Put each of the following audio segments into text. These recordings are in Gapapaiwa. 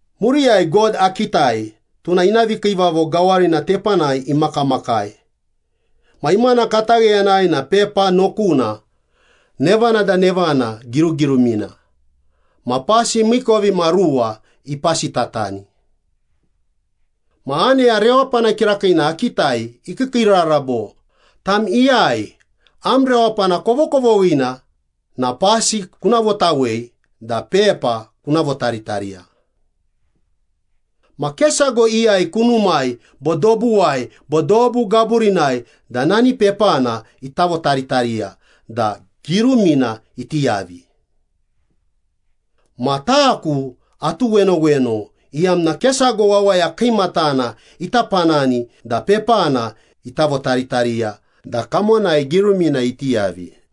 Muriyai God akitai, tuna ina vikiivavo gawarina tepanai imakamakai ma imana katagheyanai na pepa nokuna nevana da nevana girugirumina ma pasi miikovimaruwa ipasitatani. Ma aneya rewapana kirakiina akitai ikiikiirara bo, “Tam iyai am rewapana kovokovoghina na pasi kuna votawei da pepa kuna votaritariya.” Ma ke sago iyai kunumai bo dobuwai bo dobu gaburinai da nani pepana ita votaritariya da girumina iti yavi. Ma taku atuwenoweno iyamna ke sago wawaya kiimatana ita panani da pepana ita votaritariya da kamonai girumina iti yavi.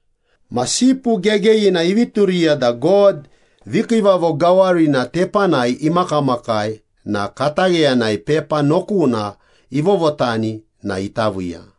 Ma Sipu Gegeyina ivi turiya da God vikiivavo gawarina tepanai imakamakai na katagheyanai pepa nokuna ivovotani na ita viiya.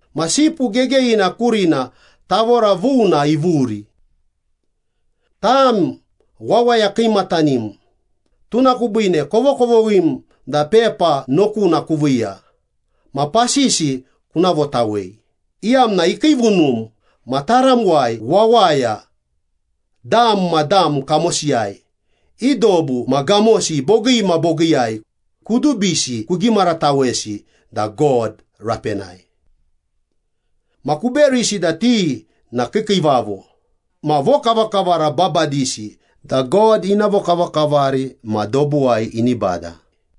Ma Sipu Gegeyina kurina tavora vuna ivuri. “Tam wawaya kiimatanim, tuna kubiine kovokovoghim da pepa nokuna kuviiya ma pasisi kuna votawei, iyamna ikiivunum ma taramuwai wawaya, dam ma dam kamosiyai, i dobu ma gamosi bogii ma bogiiyai, kudubisi kugimaratawesi da God rapenai. Ma kuberisi da ti na kiikiivavo ma vokavakavara babadisi da God ina vokavakavari ma dobuwai ini bada.”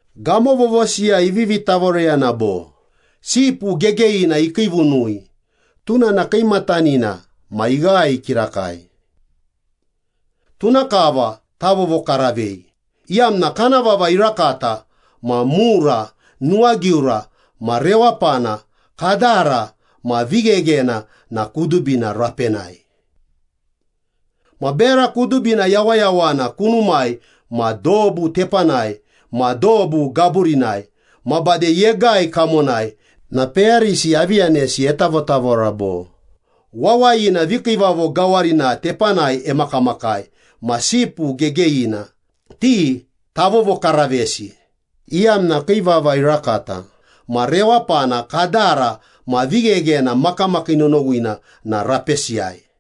Gamo vovosiyai ivivi tavoreyana bo, “Sipu Gegeyina ikiivunui, tuna na kiimatanina ma ighae kirakai. Tuna kava tavovokaravei, iyamna kana vava irakata ma mura, nuwagiura ma rewapana, kadara ma vigheghena na kudubina rapenai.” Ma bera kudubina yawayawana kunumai ma dobu tepanai ma dobu gaburinai, ma bade yegai kamonai na peyarisi avi yanesi etavotavora bo, “Wawayina vikiivavo gawarina tepanai emakamakai ma Sipu Gegeyina, ti tavovokaravesi, iyamna kii vava irakata ma rewapana, kadara ma vigheghena makamakii nonowina na rapesiyai.”